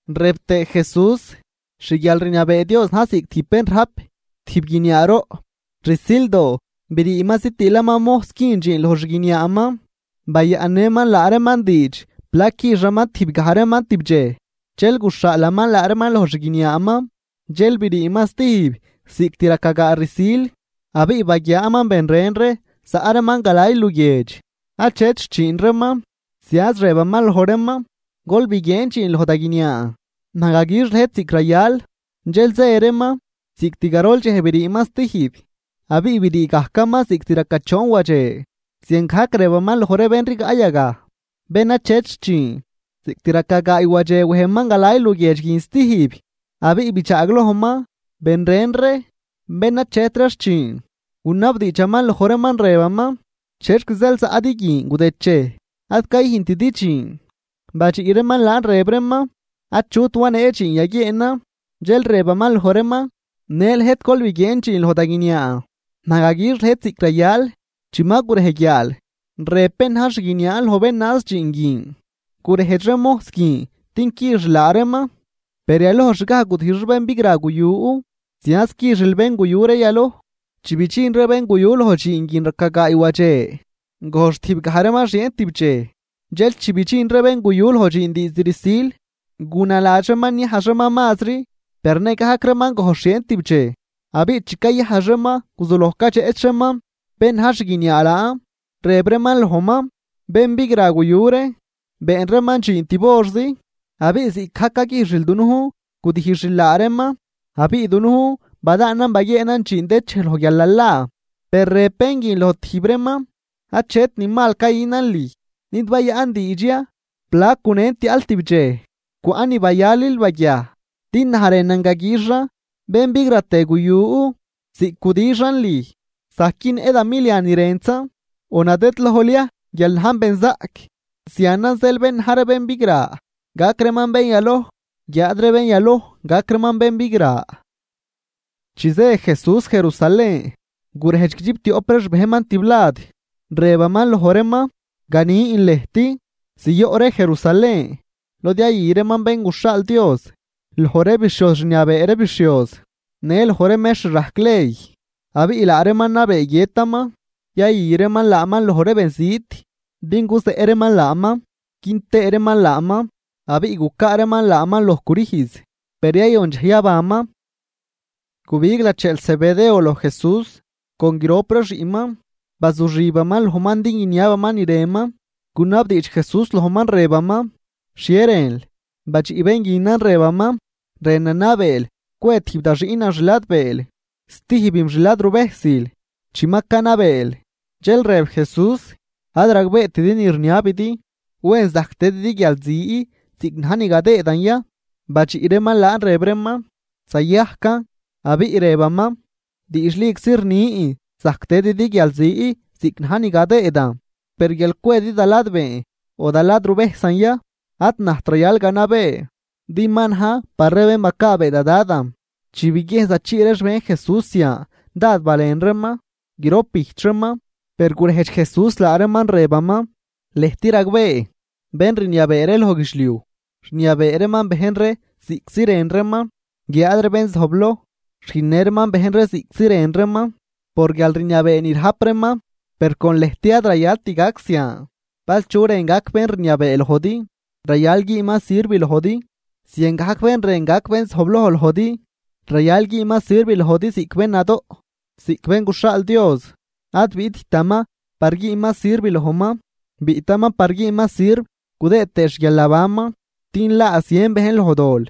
Rëb tëë Jesús: ―Xguialrniabee Dios na̱j ziꞌc tijb bén rajp tijb guiniaaroꞌ, rsildoo briiman zitiilaman mojs güün dxiin loj xguiniaaman. Bayaꞌnnëman laa reeman diidx plac quixaman tijb gaj reeman tibdxej, dxel guxhaalaman laa reeman loj xguiniaaman. Dxel briiman stijb cost raca gaa rsil, abiꞌ baguiaaman ben ren ree zaꞌ reeman galay luguiedx, achet xchiin reeman. Zianz rëbaman loj reeman: “Gol biguieen dxiin loj da guiniaan, naj gaguix lëjt ziꞌc rayal.” Dxel zë reeman. Cost garol dxej briiman stijb, abiꞌ brii gajman cost raca choon wadxe ziangajc rëbaman loj ree bén rigaꞌ yagaj, bén achet xchiin. Cost raca gaay wadxe wejman galay luguiedx guin stijb, abiꞌ bidxaaglojman ben ren ree, bén achet ree xchiin, gunabdiidxaman loj reeman, rëbaman: “¿Chexc zeel zaꞌdi guin gudëdchej ad cayüjntidi dxiin?” Badxiꞌ reeman laan rëb reeman: “Achut wanee dxiin yaguieenan.” Dxel rëbaman loj reeman: “Në lëjt gol biguieen dxiin loj da guiniaan naj gaguix lëjt ziꞌc rayal.” Chi ma gurej guiaal, rëb bén naj xguiniaan loj bén naaz dxiin guin: “Gurejdx ree mojs guin din quixil laa reeman, per yalojxgaj gudijx ree bén bigra guyu, zianz quixil bén guyu ree yaloj.” Chi bidxin ree bén guyu loj dxiin guin raca gaay wadxe, gojx tijbgaj reeman xieen tibdxej. Dxel chi bidxin ree bén guyu loj dxiin diizd rsil, gunaladx reeman niajx reeman mazri, per nëgajc reeman gojx xieen tibdxej. Abiꞌ chi cayajx reeman, guzuloj cadxeꞌch reeman bén na̱j xguiniaa laan, rëb reeman lojman: “Bén bigra guyu ree, been reeman dxiin tib horzi abiꞌ ziꞌcgajc caguijxil dunujn gudijxil laa reeman, abiꞌ dunujn badaanan baguieenan dxiin dëchej loj guialnalaa.” Per rëb bén guin loj tijb reeman: “Achet ni mal cayünan lüj. ¿Nid bayaꞌn diidx ya plac gunen tiaꞌl tibdxej? Cwaꞌ ni bayalil baguiaj. Din naj rënan gaguixan bén bigratë guyu ziꞌc gudixan lüj, zajc günnëꞌ da milian ni rëntzan. ¿O nadëdlojl ya guial najn benzaꞌc?” Zianan zeel bén na̱j ree bén bigra gac reeman bén yaloj, guiáad ree bén yaloj gac reeman bén bigra. Chi zë Jesús Jerusalén, gurejdx guidxiptioꞌp ree xbejnman tiblad, rëbaman loj reeman: ―Ganin lëjt, ziyoꞌ ree Jerusalén, lod yayü reeman Bén guxhaal Dios, loj ree bixhioz rniabee ree bixhioz në loj ree mextr rajc ley, abiꞌ laa reeman nabee guiëtaman, yayü reeman laaman loj ree benzit, din guzeꞌ reeman laaman quin tëë reeman laaman, abiꞌ gucaa reeman laaman loj crüjz, per yayon dxej yabanman. Gubig lacheel Zebedeo loj Jesús con grop ree xiꞌnman, bazuxibaman lojman din guiniabaman ni rënman. Gunabdiidx Jesús lojman, rëbaman: ―¿Xhie rënl? Badxiꞌ bén guinan, rëbaman: ―Rënan nabeel cwe tijb da xiꞌnan xladbeel, stijbim xladruvejsil, chi ma canabeel. Dxel rëb Jesús: ―Ad ragbeetidi ni rniabidi. ¿Wen zajc tëdidi guialzi ziꞌc na̱j ni gadëëdan ya? Badxiꞌ reeman laan, rëb reeman: ―Zayajcan. Abiꞌ rëbaman: ―Diidxliczi rnin zajc tëdidi guialzi ziꞌc na̱j ni gadëëdan, per guial cwedi da ladbeen o da ladruvejsan ya ad najt rayal ganabee, din ma najn par ree bén bacaabee da Dadan. Chi biguiejn zachii ree xbejn Jesús zian dád balen reeman grop bijch reeman. Per gurejdx Jesús laa reeman, rëbaman: ―Lëjt ragbee, bén rniabee ree loj guidxliuj, rniabee reeman bejn ree ziꞌctzi rën reeman, guiáad ree bén zojbloj rüjnnë reeman bejn ree ziꞌctzi rën reeman por guialrniabee ni rajp reeman. Per con lëjt ad rayalt gac zian. Bal chu rën gac bén rniabee lojdi, rayal güünman sirv lojdi. Ziangajc bén rën gac bén zojbloj lojdi, rayal güünman sirv lojdi ziꞌc bén nadoꞌ. Ziꞌc Bén guxhaal Dios ad biꞌttaman par güün reeman sirv lojman, biꞌtaman par güünman sirv gudëë tëë xguialnabanman din laa zien bejn loj dol.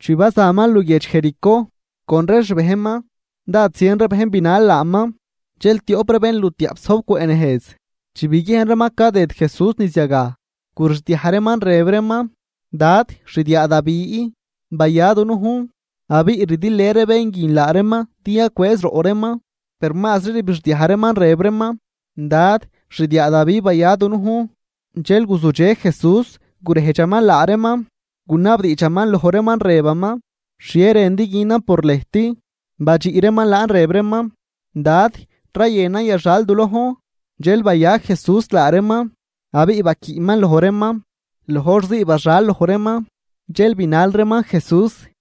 Chi bazaman luguiedx Jericó con ree xbejnman, dád zien ree bejn binal laaman. Dxel tioꞌp ree bénlutiaꞌp zojb cwëꞌ nejz chi biguiejn reeman cadëd Jesús niz yagaj, gurixdiaj reeman rëb reeman: ―¡Dad, xdiaa Davi, baya dunujn! Abiꞌ rdilë ree ben guin laa reeman din yacwëëz roꞌ reeman, per mazri ribixdiaj reeman rëb reeman: ―¡Dad, xdiaa Davi, baya dunujn! Dxel guzudxe Jesús, gurejdxaman laa reeman, gunabdiidxaman loj reeman, rëbaman: ―¿Xhie rëndi günan por lëjt? Badxiꞌ reeman laan, rëb reeman: ―Dad, rayënan yaxal du lojn. Dxel baya Jesús laa reeman, abiꞌ baquiꞌman loj reeman. Loj hor zii baxal loj reeman, dxel binal reeman Jesús.